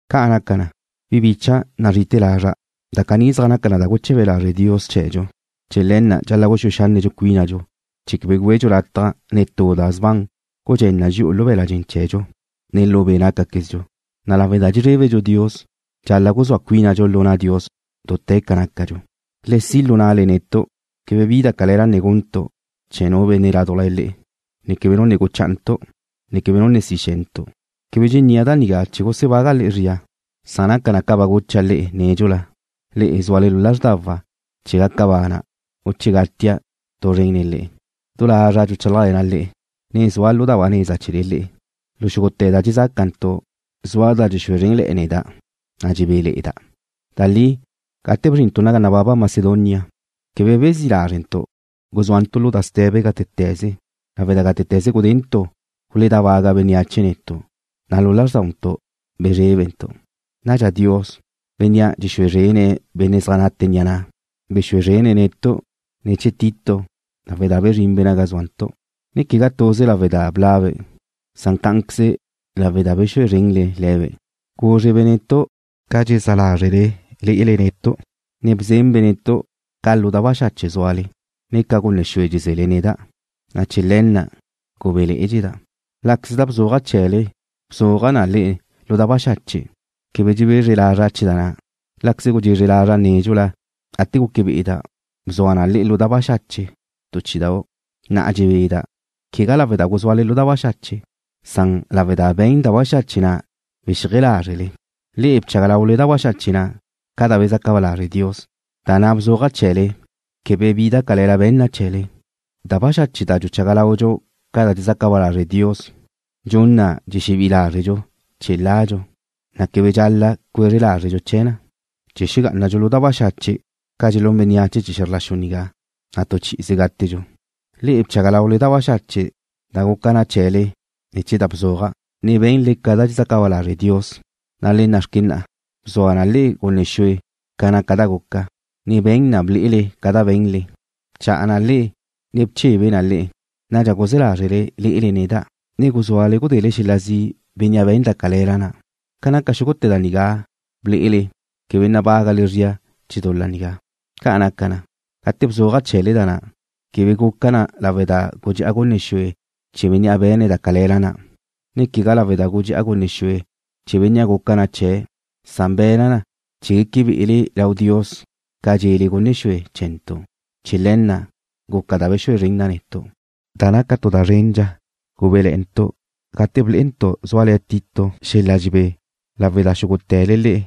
Ca' naca na, bi bícha'dau' nazri'ite̱ lazra', da caní zaj naca na da guche̱be lazre' Dios chee̱dxu. Chee̱ le̱ na' dxal-la' guxúe xanne' cuínadxu chee̱ quebe güedxu lataj netú da sban gudxén na dxi'u lu be̱la' dxen chee̱dxu, ne lu be' nácaquezdxu, na' lawe' da dxezrébedxu Dios dxal-la' guzúa cuínadxu lu na' Dios dute̱ ca nácadxu. Le si' lu na'le netu'. Quebe bi da cale̱la ne guntu' chee̱ nu benne' ládujla le'e, ne quebe nu ne guchántu', ne quebe nu ne si xe̱ntu'. Quebe dxennía' da nigá chee̱ gusebaga' le'e zria, san naca na ca ba gucha' le'e nédxula, le'e zúale lu lázrdawa' che gaca bana', u che gatia' tu zrente̱ nen le'e. Du lazra' dxuchálajle̱na' le'e, ne zua' lu da ba neza ne̱ chee̱le le'e. Lu xúgute̱ da dxezácantu' zua da dxexúe zrénle̱'e̱ neda', na' dxebéle̱'e̱da'. Da li, gate bzrintu' naga nababa Macedonia, quebe bezí' lázrentu'. Guzúantu' lu da ste̱be gátete̱ze, lawe' da gátete̱ze gudentu' guledábaga bénneache netu', na' lu lázrdauntu' bezrébentu'. Nadxa Dios, Bénnea' dxexúe zrene̱' benne' zaj nate ni'a ne̱'e̱, bexúe zrene̱' netu' ne̱ chee̱ Tito lawe' da bezrinbe' naga zúantu', ne quegá tuze lawe' da bla'be', san cá'anqueze lawe' da bexúe zrenle le̱be'. Gúzrebe' netu' ca dxezá lázrele lé'ele netu', ne bzenbe' netu' ca lu da baxache' zúale, ne ca gunne xue dxeze̱le neda', na' chee̱ le̱ na' gubéle̱'e̱dxeda'. Láqueze da bzuaja' chee̱le bzua na le'e lu da baxache', quebe dxebezre lazra' chee̱ da na'. Láqueze gudxezre lazra' nédxula gate guque be'eda' bzua na le'e lu da baxache' tu chí'idau', na'a dxebeda', quegá lawe' da guzúale lu da baxache', san lawe' da be̱n da baxache' na' bexíaje lázrele. Le'e bchaga laule da baxache' na' ca da bezaca ba lazre' Dios, na' da bzuaja' chee̱le quebe bi da cale̱la be̱n na chee̱le. Da baxache' da dxuchaga laudxu ca da dxezaca ba lazre' Dios dxun na dxexebí'i lázredxu chee̱ ladxu, na' quebe dxal-la' cuezre lázredxu chee̱ na. Che xegá'anadxu lu da baxache' ca dxelún bénneache chee̱ xe̱zr la xu nigá, na' tu chi'ize gátedxu. Le'e bchaga laule da baxache' da guca na chee̱le ne̱ chee̱ da bzuaja', ne be̱nle ca da dxezaca ba lazre' Dios, na' le nna'xque na'a: Bzua na le'e gunne xue ca naca da guca, ne be̱n na ble'ele ca da be̱nle. Bcha'a na le'e, ne bchebe na le'e. Nadxa guzé̱ lázrele lé'ele neda', ne guzúale gudele xel-la zi' bénnea' be̱n da cale̱la na'. Ca naca xúgute̱ da nigá ble'ele quebe nabágale zria chee̱ dul-la nigá. Ca' naca na, gate bzuaja' chee̱le da na', quebe guca na lawe' da gudxe'a gunne xue chee̱ bénnea' be̱ne̱' da cale̱la na', ne quegá lawe' da gudxe'a gunne xue chee̱ bénnea' guca na chee̱', san be̱na' na chee̱ gueque be'ele lau Dios ca dxele gunne xue chee̱ntu'. Chee̱ le̱ na' guca da bexúe zren na netu'. Da naca tu da zrendxa, gubéle̱'e̱ntu' gate blé'entu' zúale̱ Tito xel-la dxebé, lawe' da xúgute̱le le'e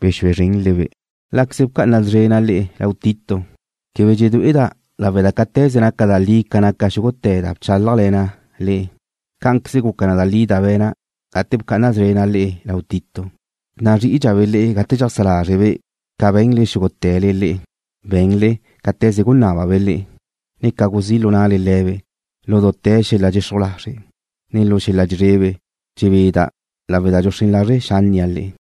bexúe zrenle-be'. Láqueze bca'ana szrena' le'e lau Tito, quebe dxedué'eda', lawe' da cáte̱ze naca da li ca naca xúgute̱ da bchálajle̱na' le'e, cá'anqueze guca da li da be̱na' gate bca'ana szrena' le'e lau Tito. Nazrí'idxabe' le'e gate dxajsá lázrebe' ca be̱nle xúgute̱le le'e, be̱nle cáte̱ze gunábabe' le'e, ne ca guzí' lu na'le le̱be' lu dute̱ xel-la dxexruj lazre', ne lu xel-la dxezrebe. Dxebeda' lawe' da dxuxrén lazre' xánnia' le'e.